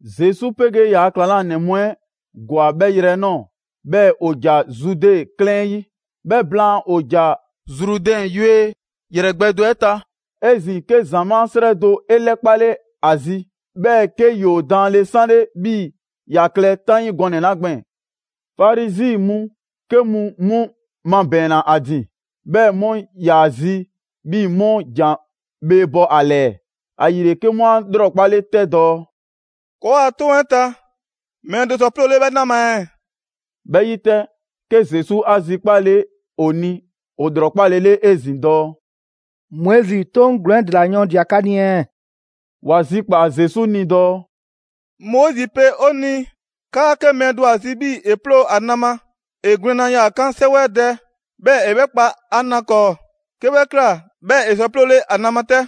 Zesu 'pegee ‑yaa' ‑klaŋlanɛ mu 'ɛ ‑gwa 'bhɛ yrɛ 'ɛ ꞊nɔɔ, 'bhɛɛ‑ ‑o ‑ja Zude 'klɛɛn 'ɛ 'yi. 'Bhɛ blaan, ‑o ‑ja Zrudɛn yue ‑yrɛ gbɛ do 'ɛ ta. 'Ezin‑ 'ke ‑zamaa' 'srɛ do 'e 'lɛkpale ‑a zi, 'bhɛɛ‑ 'ke ‑yoo daanle 'sanle 'bhii‑ ‑ya klɛ 'taŋii gɔnɛ‑ 'la gbɛɛn‑. Farizi mu 'ke mu 'mu 'mabɛɛnna ‑a ‑din, 'bhɛɛ‑ 'mu ‑yaa zi 'bhii‑ 'mu ‑jan bhee bɔ ‑a ‑lɛɛ, ‑ayile 'ke 'mu 'a 'lrɔkpale 'tɛ dɔɔ: «‑Kɔɔa' 'toŋ 'ɛ ta, mɛɛ do sɔ 'ploole 'bhɛ na ma ɛɛ?» 'Bhɛ 'yi 'tɛ, 'ke Zesu 'a zikpale ‑o ni ‑o ‑lrɔkpalele 'ezin‑ dɔɔ: «Moizi 'toŋ ‑glɔɔn 'ɛ ‑dela yɔɔndia‑ 'ka ni ɛɛ?» ‑Wa zikpaa‑ Zesu ni dɔɔ: «Moizi pe 'o ni 'kaa 'ke mɛɛ do ‑a zi 'bhii‑ ‑e 'ploo‑ ‑a na ma, ‑e gwlɛnna yaa‑ 'kan 'sɛwɛdɛ, 'bhɛɛ‑ ‑e 'bhɛ kpa ‑a na 'kɔɔ; 'ke 'bhɛ ꞊kla, 'bhɛɛ‑ ‑e sɔ 'ploole ‑a na ma 'tɛ.»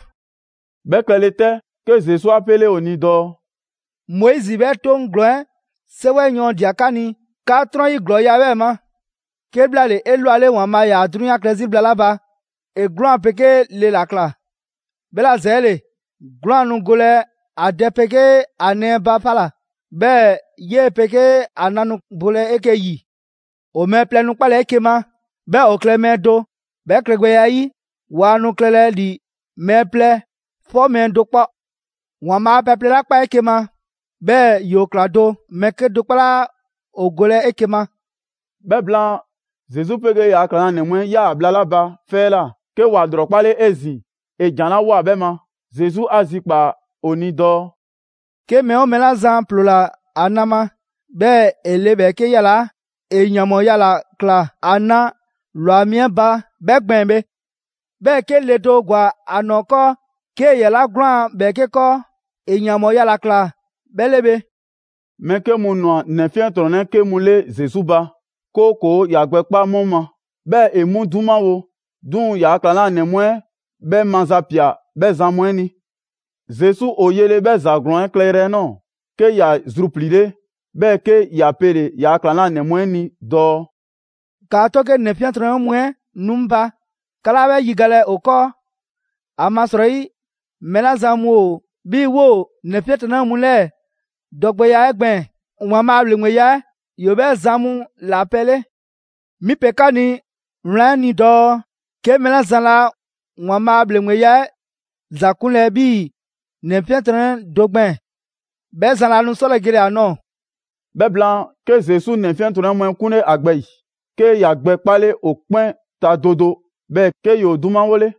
'Bhɛ klɛle 'tɛ, 'ke Zesu 'a 'pele ‑o ni dɔɔ: «Moizi 'bhɛ 'toŋ ‑glɔɔn 'ɛ 'sɛwɛyɔɔndia 'ka ni, 'ka 'trɔn 'yi ‑glɔɔya' 'ɛ 'bhɛɛ‑ ma. 'Kebhlaale, 'elwale ‑Waanbhaa' ‑yaa 'drunyan klɛ 'zi bhla 'la ba, ‑e 'gwlaan‑ 'pegee le ‑la ꞊kla. 'Bhɛla‑ ‑zɛɛle, 'gwlaan‑ nu golɛ ‑a dɛ 'pegee ‑a nɛɛ ba 'fa ‑la, 'bhɛɛ‑ 'yee‑ 'pegee ‑a na nu bolɛ 'eke‑ 'yi. ‑O mɛɛ plɛ nu 'kpalɛ‑ 'eke‑ ma, 'bhɛɛ‑ ‑o klɛ mɛɛ do, 'bhɛ klɛgbɛya 'ɛ 'yi, waa nu klɛlɛ ‑li mɛɛ plɛ 'fɔ mɛɛ do 'kpɔ. ‑Waanbhaa' pɛ plɛ 'la ꞊kpaa 'eke‑ ma, 'bhɛɛ‑ ‑yoo ꞊kla do, mɛɛ 'kedo‑ 'kpɔ 'laa ‑o golɛ 'eke‑ ma.» 'Bhɛ blaan, Zesu 'pegee ‑yaa' ‑klaŋlanɛ mu 'ɛ 'yaa‑ bhla 'la ba 'fɛ 'ɛ ꞊la, 'ke ‑wa ‑lrɔkpale 'ezin‑ ‑e ‑jan 'la ꞊woa 'bhɛ ma. Zesu 'a zikpaa‑ ‑o ni dɔɔ: «'Ke mɛɛ 'oo mɛɛ 'la zan ‑ploola ‑a na ma, 'bhɛɛ‑ ‑e le ‑bhɛɛke' ‑yalaa', ‑e ‑yanbhɔɔya ‑la ꞊kla ‑a 'na ‑lwa mi 'ɛ ba 'bhɛ gbɛɛn‑ bhe. 'Bhɛɛ‑ 'ke le do ‑gwa ‑a ‑nɔɔ 'kɔɔ, 'kee‑ 'yalaa‑ 'gwlaan‑ ‑bhɛɛke' 'kɔɔ, ‑e ‑yanbhɔɔya ‑la ꞊kla bhɛ 'le bhe.» Mɛɛ 'ke mu ꞊nwa ‑nɛ 'fiɛntrɔnnɛ 'ke mu 'le Zesu ba, 'kooko‑ ‑ya gbɛ 'kpa 'mu ma, 'bhɛɛ‑ ‑e 'mu 'dumawo. 'Duŋ‑ ‑yaa' ‑klaŋlanɛ mu 'ɛ 'bhɛ mazapia 'bhɛ zan mu 'ɛ ni. Zesu ‑o yele 'bhɛ ‑za ‑glɔɔn 'ɛ klɛyrɛ 'ɛ nɔɔ‑, 'ke ‑ya zrupliile, 'bhɛɛ‑ 'ke ‑ya pele‑ ‑yaa' ‑klaŋlanɛ mu 'ɛ ni dɔɔ: «‑Kaa 'to 'ke ‑nɛ 'fiɛntrɔnnɛ mu 'ɛ nu 'ŋ ba, 'ka 'laa 'bhɛ 'yigalɛ ‑o 'kɔɔ. ‑Amasrɔyi mɛɛ 'la zan mu ‑o 'bhii‑ 'woo‑ ‑nɛ 'fiɛntrɔnnɛ mu 'lɛɛ‑ dɔgbɛya 'ɛ gbɛɛn‑, ‑Waanbhaa' a ‑bhleŋgbeya 'ɛ ‑yoo 'bhɛ zan mu ‑la pɛ 'le. 'Mi 'a pe 'ka ni wlan 'ɛ ni dɔɔ 'ke mɛɛ 'la zan laa ‑Waanbhaa' a ‑bhleŋgbeya 'ɛ ‑za 'kunlɛ‑ 'bhii‑ ‑nɛ 'fiɛntrɔnnɛ do gbɛɛn‑, 'bhɛ zan laa nu 'sɔlɛ‑ gele‑ ‑a ꞊nɔɔ.» 'Bhɛ blaan, 'ke Zesu ‑nɛ 'fiɛntrɔnnɛ mu 'ɛ 'kunle ‑a gbɛ ‑yi, 'ke ‑ya gbɛ 'kpale ‑o 'kpɛn ta do do 'bhɛɛ‑ 'ke ‑yoo 'dumawole.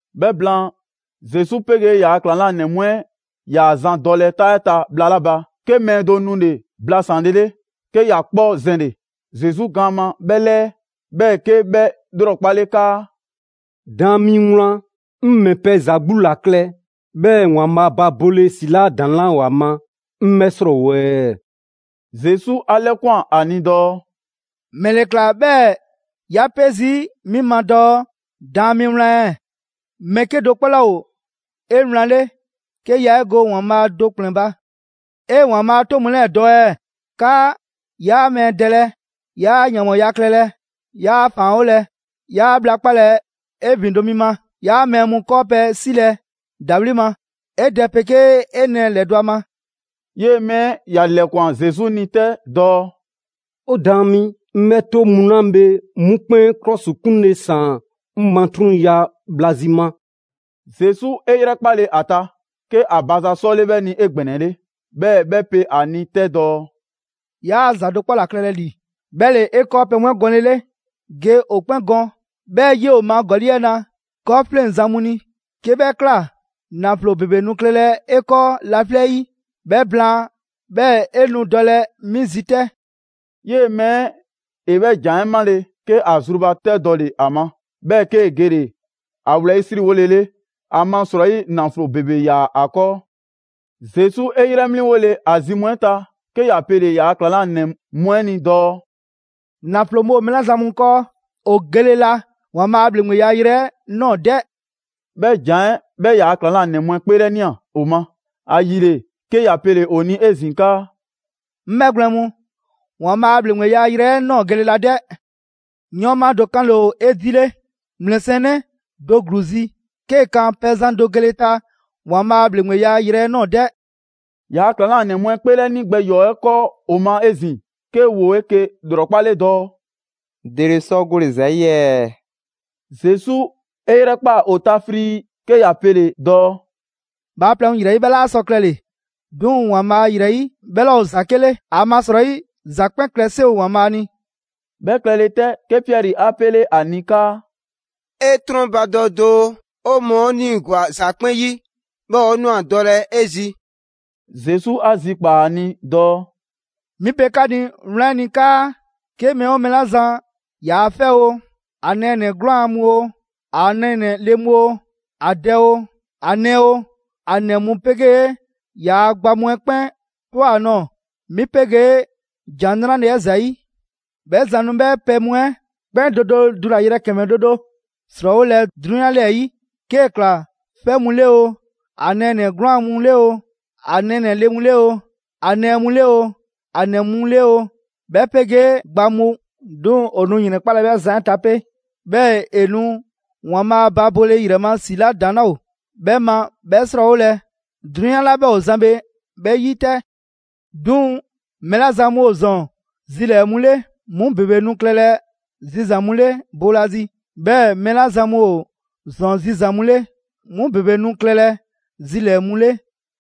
'Bhɛ blaan, Zesu 'pegee ‑yaa' ‑klaŋlanɛ mu 'ɛ 'yaa‑ zan dɔlɛ 'taa 'ɛ ta bhla 'la ba, 'ke mɛɛ do nule‑ blasanlele, 'ke ‑ya 'kpɔ zɛnle‑ Zesu gaan ma 'bhɛ 'lɛɛ, 'bhɛɛ‑ 'kee‑ 'bhɛ ‑lrɔkpale 'kaa: «Daan mi Wlan, 'ŋ ‑mɛ pɛ za 'gbu ‑la klɛ, 'bhɛɛ‑ ‑Waanbhaa' ba bole ‑si 'la ‑daŋ' 'laa ‑o ‑a ma, 'ŋ 'bhɛ 'srɔɔwo‑ ɛɛ?» Zesu 'a 'lɛkwan‑ ‑a ni dɔɔ: «‑Mɛle ꞊kla 'bhɛɛ‑ 'ya 'pe zii' 'mi ma dɔɔ‹Daan mi Wlan ɛɛ?› Mɛɛ 'kedo‑ 'kpɔ 'laa ‑o 'ewlanle, 'ke yaa 'e go ‑Waanbhaa' do ‑kplɛn ba.» «'E ‑Waanbhaa' a 'toŋ mu 'lɛɛ‑ dɔ ɛɛ? 'Kaa: ‹'Yaa mɛɛ dɛlɛ, 'yaa ‑yanbhɔɔya klɛlɛ, 'yaa ‑faanwolɛ, 'yaa bhla 'kpalɛ‑ 'e ‑vindo' mi ma, 'yaa mɛɛ mu 'kɔɔpɛ‑ 'silɛ‑ ‑dawli' ma, 'e dɛ 'pegee 'e nɛɛ ‑lɛdɔ' a ma.›» 'Yee‑ mɛɛ 'ɛ ‑ya ‑lɛkwan Zesu ni 'tɛ dɔɔ: «'O Daan mi, 'ŋ 'bhɛ 'toŋ mu 'la bhe 'mu 'kpɛn ‑klɔsikunle ‑saan 'ŋ matrunya bhla zi ma.» Zesu 'e 'yrɛkpale ‑a ta, 'ke ‑a ba ‑za 'sɔle 'bhɛ ni 'egbɛnɛle. 'Bhɛɛ‑ 'bhɛ 'pe ‑a ni 'tɛ dɔɔ: «'Yaa ‑za do 'kpɔ ‑la klɛlɛ ‑li, 'bhɛ ‑le 'e 'kɔɔpɛ‑ mu 'ɛ gɔnlele; ge ‑o 'kpɛn gɔn, 'bhɛɛ‑ 'yoo‑ ma ‑gɔli' 'ɛ 'na 'kɔɔfleŋzan mu ni. 'Kee 'bhɛ ꞊kla, ‑naflo ‑bebe nu klɛlɛ 'e 'kɔɔ laflɛ' 'yi. 'Bhɛ blaan, 'bhɛɛ‑ 'e nu dɔlɛ 'mi zi 'tɛ!» 'Yee‑ mɛɛ 'ɛ ‑e 'bhɛ ‑jan 'ɛ 'male‑, 'ke ‑a zrubatɛdɔle ‑a ma, 'bhɛɛ‑ 'kee‑ gele‑ ‑a wlɛyisriwolele, ‑amasrɔyi ‑naflo ‑bebe 'yaa‑ ‑a 'kɔɔ. Zesu 'e 'yrɛ 'mliŋgole ‑a zi mu 'ɛ ta, 'ke ‑ya pele‑ ‑yaa' ‑klaŋlanɛ mu 'ɛ ni dɔɔ: «‑Naflo mu ‑o mɛɛ 'la zan mu 'kɔɔ, ‑o gele la ‑Waanbhaa' a ‑bhleŋgbeya yrɛ 'ɛ ꞊nɔɔ 'dɛ!» 'Bhɛ ‑jan 'ɛ 'bhɛ ‑yaa' ‑klaŋlanɛ mu 'ɛ 'kpeelɛnia ‑o ma. ‑Ayile 'ke ‑ya pele‑ ‑o ni 'ezin‑ 'kaa: «'Ŋ 'bhɛgwlɛn‑ mu, ‑Waanbhaa' a ‑bhleŋgbeya yrɛ 'ɛ ꞊nɔɔ gele la 'dɛ! 'Yɔɔnma do 'kanle‑ ‑o 'edile ‑mlɛsiɛnnɛ do ‑gluu zi 'kee‑ kan pɛzan do gele ta ‑Waanbhaa' a ‑bhleŋgbeya yrɛ 'ɛ ꞊nɔɔ 'dɛ.» ‑Yaa' ‑klaŋlanɛ mu 'ɛ 'kpeelɛni gbɛ ‑yɔɔ 'ɛ 'kɔɔ ‑o ma 'ezin‑, 'ke ‑woo 'eke‑ ‑lrɔkpale dɔɔ: «‑Dele sɔ gole‑ ‑za 'yi ɛɛ?» Zesu 'e 'yrɛkpaa‑ ‑o ta frii 'ke ‑ya pele‑ dɔɔ: «Bhaaplɛŋ mu ‑yrɛ 'yi, 'bhɛ 'laa sɔ klɛle‑, 'duŋ‑ ‑Waanbhaa' ‑yrɛ 'yi, 'bhɛ 'laa ‑o ‑za 'ke 'le. ‑Amasrɔyi, ‑za 'kpɛn klɛ 'seŋ ‑o ‑Waanbhaa' ni.» 'Bhɛ klɛle 'tɛ, 'ke Piɛri 'a pele ‑a ni 'kaa: «'E 'trɔnbadɔ doo, 'o mɔɔ 'o 'niigwa‑ ‑za 'kpɛn 'yi, 'bhɛɛ‑ 'o ꞊nwa dɔlɛ 'e zi.» Zesu 'a zikpaa‑ ‑a ni dɔɔ: «'Mi pe 'ka ni wlan 'ɛ ni 'kaa: 'ke mɛɛ 'oo mɛɛ 'la zan ‑yaa' 'fɛ oo, ‑a nɛɛnɛ‑ 'gwlaan‑ mu oo, ‑a nɛɛnɛ‑ le mu oo, ‑a dɛ oo, ‑a nɛɛ oo, ‑a ‑nɛ mu 'pegee ‑yaa' gba mu 'ɛ 'kpɛn ꞊twa ‑a nɔɔ‑, 'mi 'pegee ‑Jan 'Nrale‑ 'ɛ ‑zayi', 'bhɛ zan nu 'bhɛ pɛ mu 'ɛ 'kpɛn do do dulayrɛ ‑kɛmɛ do do ‑srɔɔwolɛ 'drunyan 'lɛɛ‑ 'yi. 'Kee‑ ꞊kla 'fɛ mu 'le oo, ‑a nɛɛnɛ‑ 'gwlaan‑ mu 'le oo, ‑a nɛɛnɛ‑ le mu 'le oo, ‑a nɛɛ mu 'le oo, ‑a ‑nɛ mu 'le oo, 'bhɛ 'pegee gba mu; 'duŋ‑ ‑o nu ‑yrɛnkpalɛ 'bhɛ zan 'ɛ ta 'pe. 'Bhɛɛ‑ ‑e nu ‑Waanbhaa' ba bole ‑yrɛ ma ‑si 'la ‑daŋ' 'laa ‑o 'bhɛ ma 'bhɛ 'srɔɔwolɛ 'drunyan 'la 'bhɛ ‑o zan bhe 'bhɛ 'yi 'tɛ. 'Duŋ‑ mɛɛ 'la zan mu ‑o ‑zɔn zilɛɛ‑ mu 'le, 'mu ‑bebe nu klɛlɛ zizan‑ mu 'le boolazi, 'bhɛɛ‑ mɛɛ 'la zan mu ‑o ‑zɔn zizan‑ mu 'le, 'mu ‑bebe nu klɛlɛ zilɛɛ‑ mu 'le.»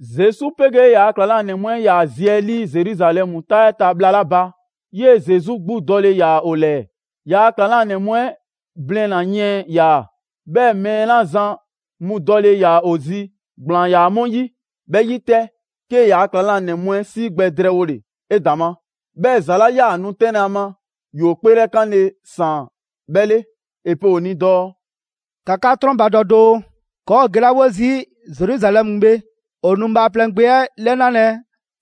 Zesu 'pegee ‑yaa' ‑klaŋlanɛ mu 'ɛ 'yaa‑ zi 'ɛ 'lii Zeruzalɛmu 'taa 'ɛ ta bhla 'la ba, 'yee‑ Zesu 'gbu dɔle ‑yaa ‑o ‑lɛɛ. Yaa ‑klaŋlanɛ mu 'ɛ blina‑ yiɛn ‑yaa, 'bhɛɛ‑ mɛɛ 'la zan mu dɔle ‑yaa ‑o zi ‑gblaan ‑yaa 'mu 'yi. 'Bhɛ 'yi 'tɛ, 'kee‑ ‑yaa' ‑klaŋlanɛ mu 'ɛ 'sii gbɛ drɛɛwole 'edaŋma, 'bhɛɛ‑ ‑za 'la 'yaa‑ nu 'tɛnlɛ‑ ‑a ma, ‑yoo 'kpeelɛkanle ‑saan 'bhɛ 'le. 'E pe ‑o ni dɔɔ: «‑Ka 'ka 'trɔnbadɔ doo, ‑kɔɔ' ‑o gelawo zii' Zeruzalɛmu bhe ‑o nu Bhaaplɛŋ Gbe 'ɛ 'lɛnalɛ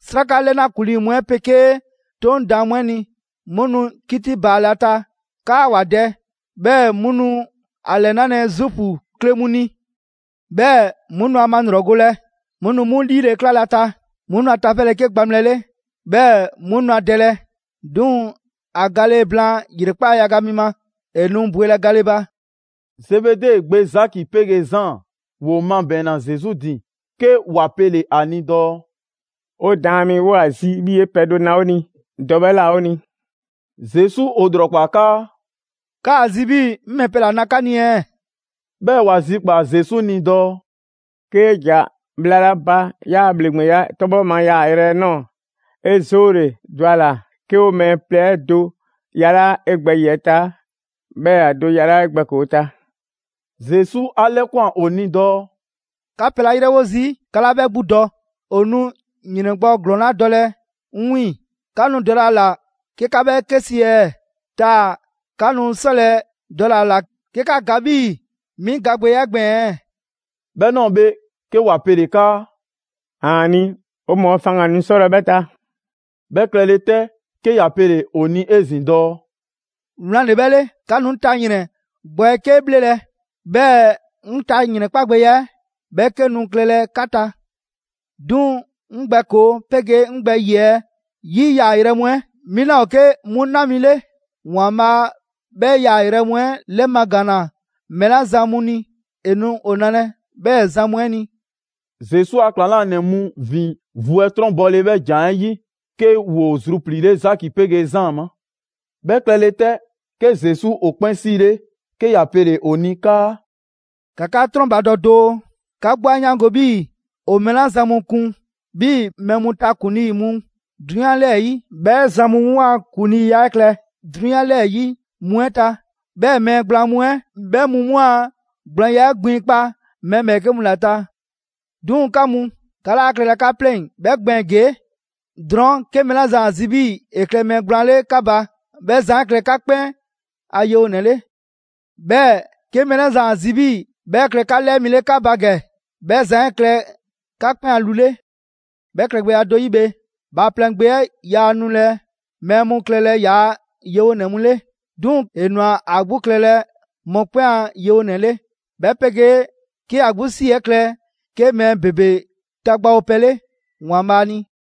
'sraka 'lɛna ‑kuŋlii' mu 'ɛ 'pegee 'Toŋ daan mu 'ɛ ni. 'Mu nu 'kiti baalɛ ‑a ta 'kaa ‑wa dɛ, 'bhɛɛ‑ 'mu nu ‑a ‑lɛnalɛ Zuufu kle mu ni. 'Bhɛ mu nu ‑a malrɔgolɛ, 'mu nu 'mu ‑liile' 'klalɛ ‑a ta, 'mu nu a tafɛlɛ 'ke gbaŋbhlɛ 'le, 'bhɛɛ‑ 'mu nu ‑a dɛlɛ. 'Duŋ‑, ‑a gale blaan ‑yrekpaa' yaga mi ma, ‑e nu bwelɛ gale ba.» Zebede gbe Zaki 'pegee Zaan, ‑woo mabɛɛnna Zesu ‑din 'ke ‑wa pele‑ ‑a ni dɔɔ: «'O Daan mi, 'woo ‑a zi 'bhii‑ 'e pɛ do na 'o ni, dɔ 'bhɛ ꞊la 'o ni.» Zesu ‑o ‑lrɔkpaa 'kaa: «'Kaa‑ zi 'bhii‑ 'ŋ ‑mɛ pɛ ‑la na 'ka ni ɛɛ?» 'Bhɛɛ‑ ‑wa zikpaa‑ Zesu ni dɔɔ: «'Kee ꞊ja bhla 'la ba 'yaa‑ ‑bhleŋgbeya 'tɔbhɔ ma yaayrɛ 'ɛ ꞊nɔɔ, 'e 'zoole‑, dɔ a ‑la 'ke ‑o mɛɛ plɛ 'ɛ do yalaa' 'e gbɛ ‑yiɛ' ta, 'bhɛɛ‑ ‑a do yalaa' 'e gbɛ ‑koo 'ɛ ta.» Zesu 'a 'lɛkwan‑ ‑o ni dɔɔ: «'Ka pɛ 'la 'yrɛwo zii' 'ka 'laa 'bhɛ 'gbu dɔ. ‑O nu ‑yrɛn gbɔ ‑glɔɔn 'la dɔlɛ 'ŋ 'wiiŋ‑, 'ka nu dɔlɛ a ‑la 'ke 'ka 'bhɛ 'ke si ɛɛ? Taa‑ 'ka nu 'sɔlɛ‑ dɔle‑ ‑a ‑la 'ke 'ka ga 'bhii‑ 'mi gagbɛya 'ɛ gbɛɛn‑ ɛɛ?» 'Bhɛ ꞊nɔɔ bhe, 'ke ‑wa pele‑ 'kaa: «‑Aani', 'o mɔɔ faŋgan‑ nu 'sɔlɛ‑ 'bhɛ ta.» 'Bhɛ klɛle 'tɛ 'ke ‑ya pele‑ ‑o ni 'ezin‑ dɔɔ: «Wlan ‑le 'bhɛ 'le, 'ka nu 'ŋ ta ‑yrɛn gbɔ 'ɛ 'ke 'bhlelɛ‑, 'bhɛɛ‑ 'ŋ ta ‑yrɛn 'kpagbɛya 'ɛ, 'bhɛ 'ke nu klɛlɛ 'ka ta. 'Duŋ‑ 'ŋ gbɛ ‑koo 'pegee 'ŋ gbɛ ‑yiɛ' 'yi yaayrɛ mu 'ɛ, 'mi 'laa ‑o 'ke 'mu 'na mi 'le. ‑Waanbhaa' 'bhɛ yaayrɛ mu 'ɛ 'lɛmagaanna mɛɛ 'la zan mu ni, ‑e nu ‑o nalɛ 'bhɛɛ‑ zan mu 'ɛ ni.» Zesu a ‑Klaŋlanɛ mu ‑vin vu 'ɛ 'trɔnbɔle 'bhɛ ‑jan 'ɛ 'yi, 'ke ‑woo zrupliile Zaki 'pegee Zaan ma. 'Bhɛ klɛle 'tɛ, 'ke Zesu ‑o 'kpɛn 'siilɛ‑, 'ke ‑ya pele‑ ‑o ni 'kaa: «‑Ka 'ka 'trɔnbadɔ doo! 'Ka 'gbu 'a 'yaango‑ 'bhii‑ ‑o mɛɛ 'la zan mu kun 'bhii‑ mɛɛ mu ta ‑kuŋlii' mu 'drunyan 'lɛɛ‑ 'yi, 'bhɛ zan mu 'mu a ‑kuŋliiya 'ɛ klɛ 'drunyan 'lɛɛ‑ 'yi mu 'ɛ ta. 'Bhɛɛ‑ mɛɛ gblaan mu 'ɛ, 'bhɛ mu 'mu a gblaanya 'ɛ gbinkpa mɛɛ ‑bhɛɛke' mu ‑la ta. 'Duŋ‑ 'ka mu, 'ka laa klɛlɛ 'ka pleŋ‑ 'bhɛ gbɛɛn‑ ‑gee'. Drɔɔn', 'ke mɛɛ 'la zan ‑a zi 'bhii‑ ‑e klɛ mɛɛ gblaan 'le 'ka ba, 'bhɛ zan 'ɛ klɛ 'ka 'kpɛn ‑a yewonɛ 'le. 'Bhɛɛ‑ 'ke mɛɛ 'la zan ‑a zi 'bhii‑ 'bhɛ klɛ 'ka 'lɛɛ mi 'le 'ka ba ‑gɛ, 'bhɛ zan 'ɛ klɛ 'ka 'kpɛn ‑a lu 'le. 'Bhɛ klɛgbɛya do 'yi bhe, Bhaaplɛŋ Gbe 'ɛ yaa nulɛ mɛɛ mu klɛlɛ ‑yaa' yewonɛ mu 'le, 'duŋ‑ ‑e ꞊nwa ‑a 'gbu klɛlɛ mɔkpɛn' a yewonɛ 'le, 'bhɛ 'pegee 'ke ‑ya 'gbu 'si 'ɛ klɛ 'ke mɛɛ ‑bebe tagbawopɛ 'le ‑Waanbhaa' ni.»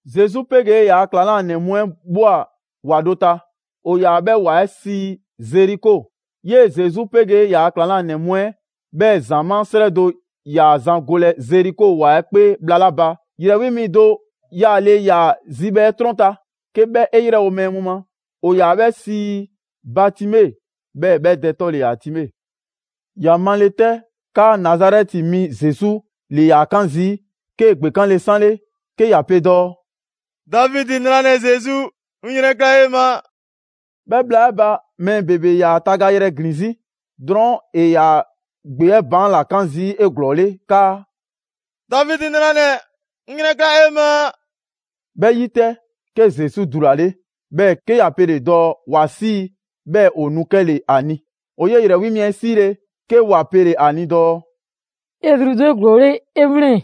Zesu 'pegee ‑yaa ‑klaŋlanɛ mu 'ɛ ꞊bhwa ‑wa do ta, ‑o ‑yaa 'bhɛ ‑wa 'ɛ sii Zeriko. 'Yee‑ Zesu 'pegee ‑yaa' ‑klaŋlanɛ mu 'ɛ, 'bhɛɛ‑ ‑zamaa' 'srɛ do ‑yaa zan golɛ Zeriko ‑wa 'ɛ 'kpee bhla 'la ba, ‑yrɛ 'wi mi do yaale ‑yaa zibhɛ 'ɛ 'trɔn ta, 'ke 'bhɛ 'e ‑yrɛwo' mɛɛ mu ma. ‑O ‑yaa 'bhɛ sii Batime, 'bhɛɛ‑ 'bhɛ dɛ 'tɔ ‑le ‑yaa Time. ‑Ya male 'tɛ 'kaa Nazarɛti mi Zesu ‑le ‑yaa 'kan zii', 'kee‑ ‑gbekanle 'sanle 'ke ‑ya pe dɔɔ: «Davidi 'nranɛ‑ Zesu, 'ŋ 'yrɛnkla 'e ma!» 'Bhɛ bhla 'ɛ ba, mɛɛ ‑bebe ‑yaa ‑a tagayrɛ ‑glin 'zi. Drɔɔn' ‑e ‑yaa gbe 'ɛ baan' ‑la 'kan zii' 'eglɔɔle 'kaa: «Davidi 'nranɛ‑, 'ŋ 'yrɛnkla 'e ma!» 'Bhɛ 'yi 'tɛ, 'ke Zesu dulale, 'bhɛɛ‑ 'ke ‑ya pele‑ dɔɔ ‑wa 'sii 'bhɛɛ‑ ‑o nu 'kɛle‑ ‑a ni. ‑O 'yee‑ ‑yrɛ 'wi mi 'ɛ 'siile‑, 'ke ‑wa pele‑ ‑a ni dɔɔ: «'E zrudɔ 'eglɔɔle, 'e 'wlɛn‑,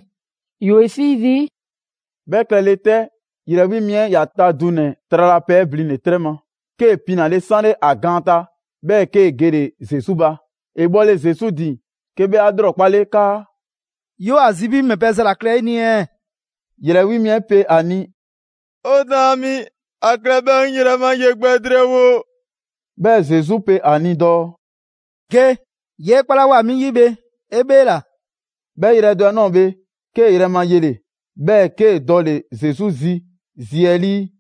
‑yoo 'e 'sii zii'.» 'Bhɛ klɛ le 'tɛ, ‑yrɛ 'wi mi 'ɛ ‑ya ta dunɛ‑ tralapɛ 'ɛ blinle‑ 'trɛ ma, 'kee‑ pinale 'sanle ‑a gaan ta, 'bhɛɛ‑ 'kee‑ gele‑ Zesu ba. ‑E bhɔle Zesu ‑din, 'ke 'bhɛ 'a ‑lrɔkpale 'kaa: «'Yoo‑ ‑a zi 'bhii‑ 'ŋ ‑mɛ pɛ za ‑la klɛ 'e ni ɛɛ?» ‑Yrɛ 'wi mi 'ɛ pe ‑a ni: «'O Daan mi, ‑a klɛ 'bhɛɛ‑ 'ŋ yrɛ ma ye gbɛ drɛɛwo.» 'Bhɛɛ‑ Zesu pe ‑a ni dɔɔ: «Ge! 'Yee 'kpalawoa 'mi 'yi bhe, 'e 'bheela‑!» 'Bhɛ yrɛ do 'ɛ ꞊nɔɔ bhe, 'kee‑ yrɛ ma yele‑, 'bhɛɛ‑ 'kee‑ dɔle‑ Zesu zi zi 'ɛ 'lii.